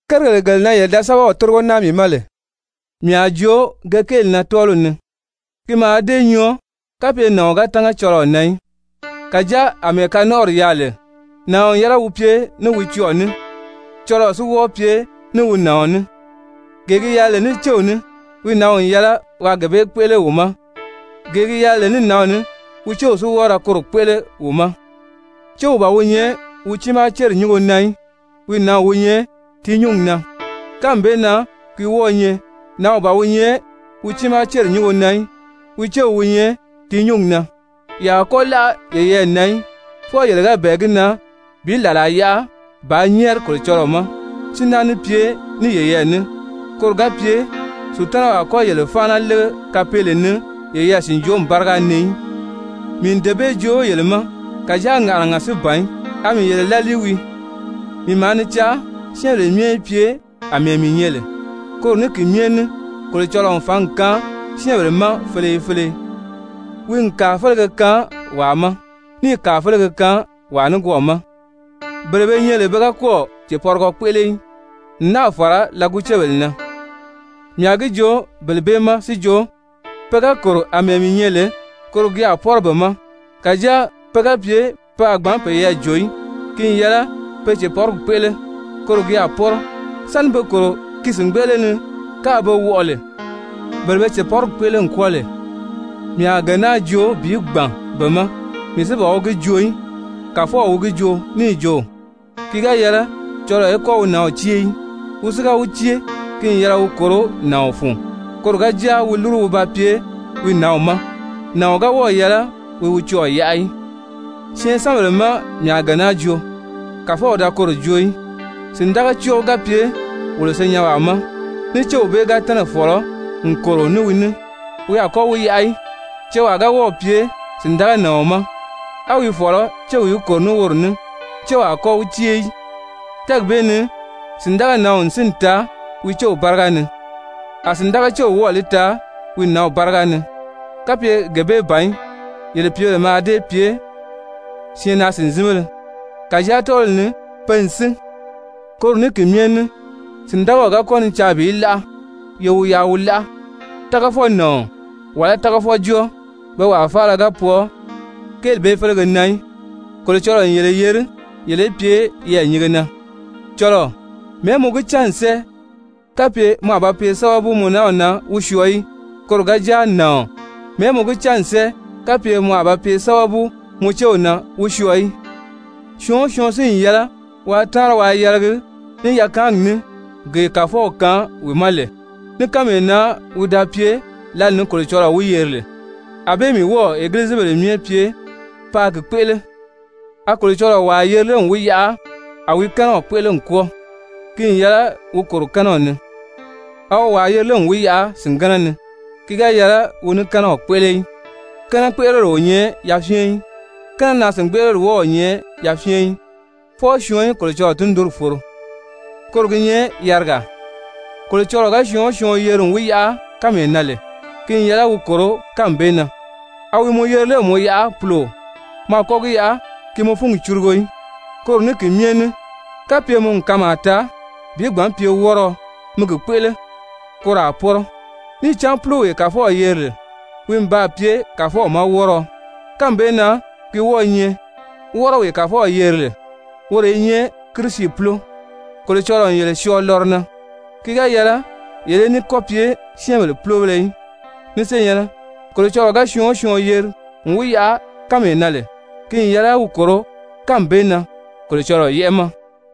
Kérigèle gele na yele da sɛ́bɛw tórigo naa mii ma lè, mii a joo ge kéeli na tɔ́ɔliw ni. Ki mǎà dée nyɔɔ kapye nàɔn ga tánga cɔlɔɔ na í. Kàjáa àmɛɛ kanɔnʔɔri yaà lè, nàɔn n yɛlɛ wi pye ní wi cɔɔ̀ ní, cɔlɔɔ si wɔ́ɔ pye ní wi nàɔn ní. Gee gi yɛlɛ lè ní céw ní, wi nǎnw n yɛlɛ waa gee bee kpéʔele wi ma, gee gi yɛlɛ lè ní nǎnw ní, wi céw si wɔ́ɔ ra koro kpéʔele wi ma. Céw ban wi nyɛ wi tiimaa céri nyúngo na í, wi nǎnw wi nyɛ ti nyúngi na. Kánmi bee na ki wɔ́ɔ̄ nyɛ nǎnw ban wi nyɛ wi tiimaa céri nyúngo na í, wi céw wi nyɛ ti nyúngi na. Ye a kɔ́ láʔa yeyɛɛ na í, fwɔɔ yele ga bɛ̀ɛ gi na bi làlaa yaʔa bàā nyɛ́ɛri Kolocɔlɔɔ ma. Si náa ní pye ní yeyɛɛ ní, koro ga pye Sutanaw a kɔ́ yele fáana lége kapeele ni yeyɛɛ sìnjomi báriga ni í. Mii n dee bee joo yele ma, kàjáa ŋàʔanaga si ban í, a mii yele lálii wii. Mii maa ni caa syɛ́ɛnbèle myɛ í pye àmɛɛ mii nyɛ lè. Koro ní ki myɛ ní Kolocɔlɔɔ n fǎngi kaan syɛ́ɛnbèle ma feleye feleye, wi n kàa félege kaan wàa ma, níì kàa félege kaan wàa nikwɔɔ ma. Bele be nyɛ lè pe ga kɔ́ɔ̀ cèpɔrigɔ kpéʔele í, n náà fàra lɔgucebèle na mii a gi joo bele bee ma si jo, pe ga kòro àmɛɛ mii nyɛ lè, koro gi a pɔ́rɔ be ma. Kàjáa pe ga pye pe a gbǎn peyɛɛ jò í, ki n yɛlɛ pe cèpɔrigi kpéʔele. Koro gi a pɔ́rɔ, sáni be kòro ki sìngbeʔele ni káā be wɔʔɔ lè. Bele be cèpɔrigi kpéʔele n kwɔ́ɔ lè, mii a gee naa joo bi gbàn be ma, mii si ban wi gi joo í, Kàfɔw wi gi joo níì jo: «Ki ga yɛlɛ cɔlɔɔ í kɔ́ wi nǎnw cée í. Wi si ga wi cée, ki n yɛlɛ wi kòro nàɔn fun, koro ga jáa wi lúru wi ba pye wi nǎnw ma, nàɔn ga wɔ́ɔ̀ yɛlɛ wi wi cɔɔ̀ yaʔa í.» Syɛɛnsanbèle má mii a gee naa joo, Kàfɔw da koro joo í, sìndagacɔɔ ga pye wolo senyɛnwaa ma, ní céw bee ga tɛ́nɛ̀ fɔ̀lɔ n kòro ní wi ní, wi a kɔ́ wi yaʔa í. Cewaa ga wɔ́ɔ̀ pye sìndaganàɔn ma, á wi fɔ̀lɔ céw í kòro ní woro ní, céw a kɔ́ wi cée í. Tɛ́ɛgi bee ni sìndaganǎnw n sínni taa wi céw báriga ni, a sìndagacew wɔ́ɔ̀ li taa wi nǎnw báriga ni, kapye gee bee ban í, yele pìíbèle mǎà dée pye syɛɛnnaa-sìnzinbéle, kàjáa tɔ́ɔliw ni pe n sín. Koro ní ki myɛ ní sìndagaw ga kɔ́ ni caa bi láʔa, ye wi yaʔa wi láʔa. Tágafɔnàɔn wàlá tágafɔjɔɔ, pe wàa faala ga pwɔɔ kéeli bee félege na í. Kolocɔlɔɔ n yele yeri yele í pye yɛɛ̀nyinge na. Cɔlɔɔ, mɛ̀ɛ́ mɔ gi cán n sɛ́ɛ kapye mɔ a ba pye sábabu mɔ nanw na wi syɔɔ í? Koro ga jáa, nàɔn, mɛ̀ɛ́ mɔ gi cán n sɛ́ɛ kapye mɔ a ba pye sábabu mɔ céw na wi syɔɔ í? Syɔɔn o syɔɔn si n yɛlɛ waa táanri waa yɛlɛgi ní yakaangi ní gee Kàfɔw kaan wi ma lè, ní kánmee na wi da pye lǎli ni Kolocɔlɔɔ wi yeri lè. Anbée mii wɔ́ɔ̀ egilizibèle myɛ pye paa gi kpéʔele. A Kolocɔlɔɔ wàa yeri lé n wi yaʔa a wi kɛ́nɛw kpéʔele n kwɔ́ɔ? Ki n yɛlɛ wi kòro kɛ́nɛw ni. A wi wàa yeri lé n wi yaʔa sìngɛnɛ ni? Ki ga yɛlɛ wi ní kɛ́nɛw kpéʔele í. Kɛ́nɛkpeʔeleri o nyɛ yafyɛn í, kɛ́nɛnaa-sìngbeʔeleri wɔ́ɔ o nyɛ yafyɛn í, fwɔɔ syɔɔn í Kolocɔlɔɔ tundunri foro, koro gi nyɛ yarigaa. Kolocɔlɔɔ ga syɔɔn o syɔɔn yeri n wi yaʔa kánmee na lè, ki n yɛlɛ wi kòro kánmi bee na. A wi mɔ yeri lé n mɔ yaʔa puloo? Mɔ a kɔ́ gi yaʔa ki mɔ fúngi curugo í. Koro ní ki myɛ ní kapye mɔ n kanmaa taa bi gbǎn pye wɔ́rɔɔ, mi gi kpéʔele, koro a pɔ́rɔ. Níì cán púlowee Kàfɔw yeri lè, wi n baa pye Kàfɔw ma wɔ́rɔɔ. Kánmi bee na gi wɔ́ɔ̄ nyɛ wɔ́rɔwee Kàfɔw yeri lè, woro i nyɛ Kirisi púlo. Kolocɔlɔɔ n yele syɔɔ lɔrɔ na. Ki ga yɛlɛ yele í ní kɔ́ pye syɛ́ɛnbèle púlobéle í. Ni senyɛ̀nnɛ, Kolocɔlɔɔ ga syɔɔn o syɔɔn yeri n wi yaʔa kánmee na lè, ki n yɛlɛ wi kòro kánmi bee na Kolocɔlɔɔ yɛ́ʔɛ ma.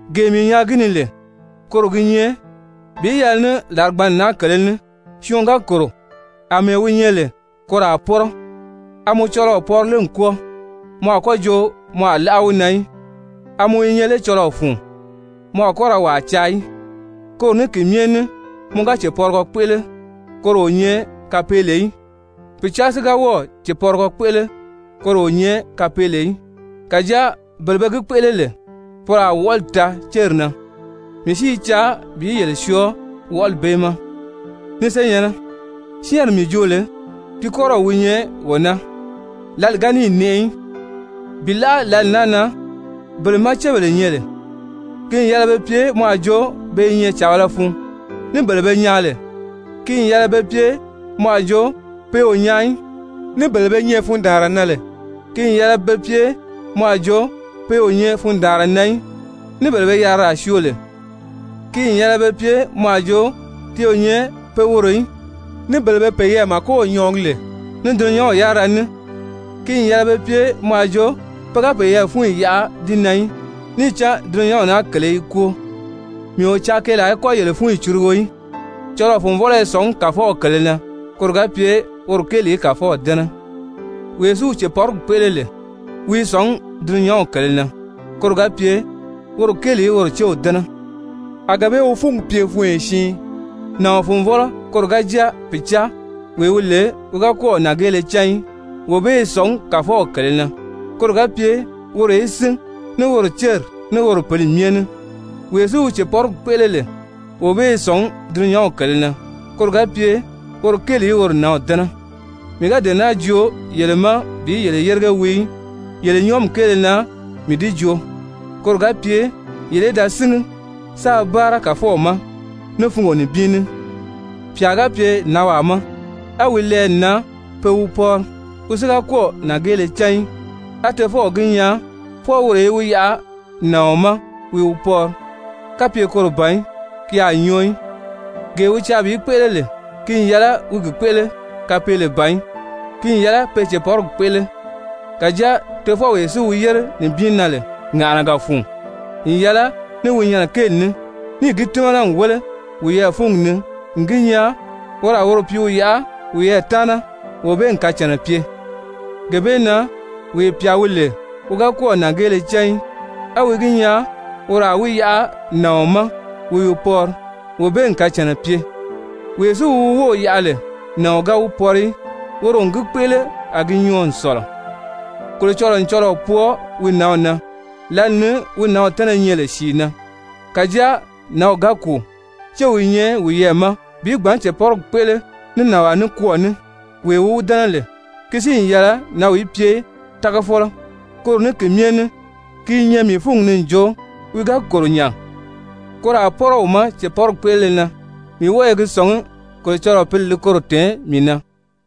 Gee mii nyaa gi ni lè koro gi nyɛ, bi yɛlɛ ní làrigbanni naa kèlē ní syɔɔn ga kòro àmɛɛ wi nyɛ lè, koro a pɔ́rɔ. A mɔ cɔlɔɔ pɔri lé n kwɔ́ɔ? Mɔ a kɔ́ jo mɔ a láʔa wi na í. A mɔ i nyɛ lé cɔlɔɔ fun? Mɔ a kɔ́ ra wàa caa í. Koro ní ki myɛ ní mɔ ga cèpɔrigɔ kpéʔele, koro o nyɛ kapeele í, pìcaa si ga wɔ́ɔ̀ cèpɔrigɔ kpéʔele, koro o nyɛ kapeele í. Kàjáa bele be gi kpéʔele lè, poro a wɔʔɔli taa céri na. Mii si i caa bi yele syɔɔ wɔʔɔli bee ma. Ni senyɛ̀nnɛ, syɛ́ɛnri mii joo lè ti kɔ́rɔw wi nyɛ wee naa, lǎli ga níì nɛʔɛ í. Bi láʔa lǎli naa na bele má cébèle nyɛ lè, ki n yɛlɛ be pye mɔ a jo pe i nyɛ càbala fun, ní bele be nyaan lè, ki n yɛlɛ be pye mɔ a jo pe o nyaan í, ní bele be nyɛ fundaanra na lè, ki n yɛlɛ be pye mɔ a jo pe o nyɛ fundaanra na í, ní bele be yariraa syoo lè, ki n yɛlɛ be pye mɔ a jo ti o nyɛ pe worò í, ní bele be peyɛɛ màkow nyɔɔgi lè ní dulunyanw yárira ní, ki n yɛlɛ be pye mɔ a jo pe ga peyɛɛ fúnyi yaʔa di na í, níì cán dulunyanw naa kèlē i kwóo. Mii o caa keelaa í kɔ́ yele fúnyi curugo í. Cɔlɔɔ-fùnvɔlɔ i sɔ̀ngí Kàfɔw kèlē na, koro ga pye woro kéeli í Kàfɔw dɛ́nɛ. Wee si wi cèpɔrigi kpéʔele lè, wi i sɔ̀ngí dulunyanw kèlē na, koro ga pye woro kéeli í woro céw dɛ́nɛ. A gee bee wi fúngi pye funyo siin. Nàɔn-fùnvɔlɔ koro ga jáa pìcaa, wee wi lè wi ga kɔ́ɔ̀ nàngeele cán í, wee bee i sɔ̀ngí Kàfɔw kèlē na, koro ga pye woro í sín ní woro céri, ní woro pǐli myɛ ní. Wee si wi cèpɔrigi kpéʔele lè, wee bee i sɔ̀ngí dulunyanw kèlē na, koro ga pye woro kéeli í woro nǎnw dɛ́nɛ. Mii ga dee naa joo yele ma bi yele yérige wii í. Yele nyɔɔmi kéele na mii di joo, koro ga pye yele í da síngi, sáā báara Kàfɔw ma ní fungo nibin ní. Pyà ga pye nànwaa ma, á wi lɛɛ n nan pe wi pɔri, wi si ga kɔ́ɔ̀ nàngeele cán í, á tofɔw gi nyaa fwɔɔ woro í wi yaʔa nàɔn ma wi wi pɔri kapye koro ban í ki a nyɔɔ í, gee wi caa bi kpéʔele lè, ki n yɛlɛ wi gi kpéʔele kapeele ban í. Ki n yɛlɛ pe cèpɔrigi kpéʔele. Kàjáa tofɔwee si wi yére nibin na lè ŋàʔanaga fun n yɛlɛ ní wi nyɛnɛ kéeli ní, níì gi tímana n wéle wiyɛɛ fúngi ni n gi nyaa woro a woro pìíw yaʔa wiyɛɛ taana, wee bee n kacànna pye. Gee bee na wee pyà wi lè wi ga kɔ́ɔ̀ nàngeele cán í, á wi gi nyaa woro a wi yaʔa nàɔn ma wi wi pɔri, wee bee n kacànna pye, wee si wi wi wów yaʔa lè nàɔn ga wi pɔri í, woro n gi kpéʔele a gi nyɔɔ n sɔ̀lɔ. Kolocɔlɔɔ n cɔlɔɔ pwɔɔ wi nǎnw na lǎli ni wi nǎnw tɛ́nɛ nyɛ lè sìi na. Kàjáa nǎnw ga kùu, céw i nyɛ wiyɛɛ ma bi gbǎn cèpɔrigi kpéʔele ní nànwaa nikwɔɔ ní wee wi wi dɛ́nɛ lè. Ki si n yɛlɛ nǎnw í pye tágafɔlɔ. Koro ní ki myɛ ní ki i nyɛ mii fúngi ni n jo, wi ga kòro nya, koro a pɔ́rɔ wi ma cèpɔrigi kpéʔelele na. Mii wɔ́ɔ i gi sɔ̀ngí Kolocɔlɔɔ Pǐli li koro tɛ̀ɛn mii na.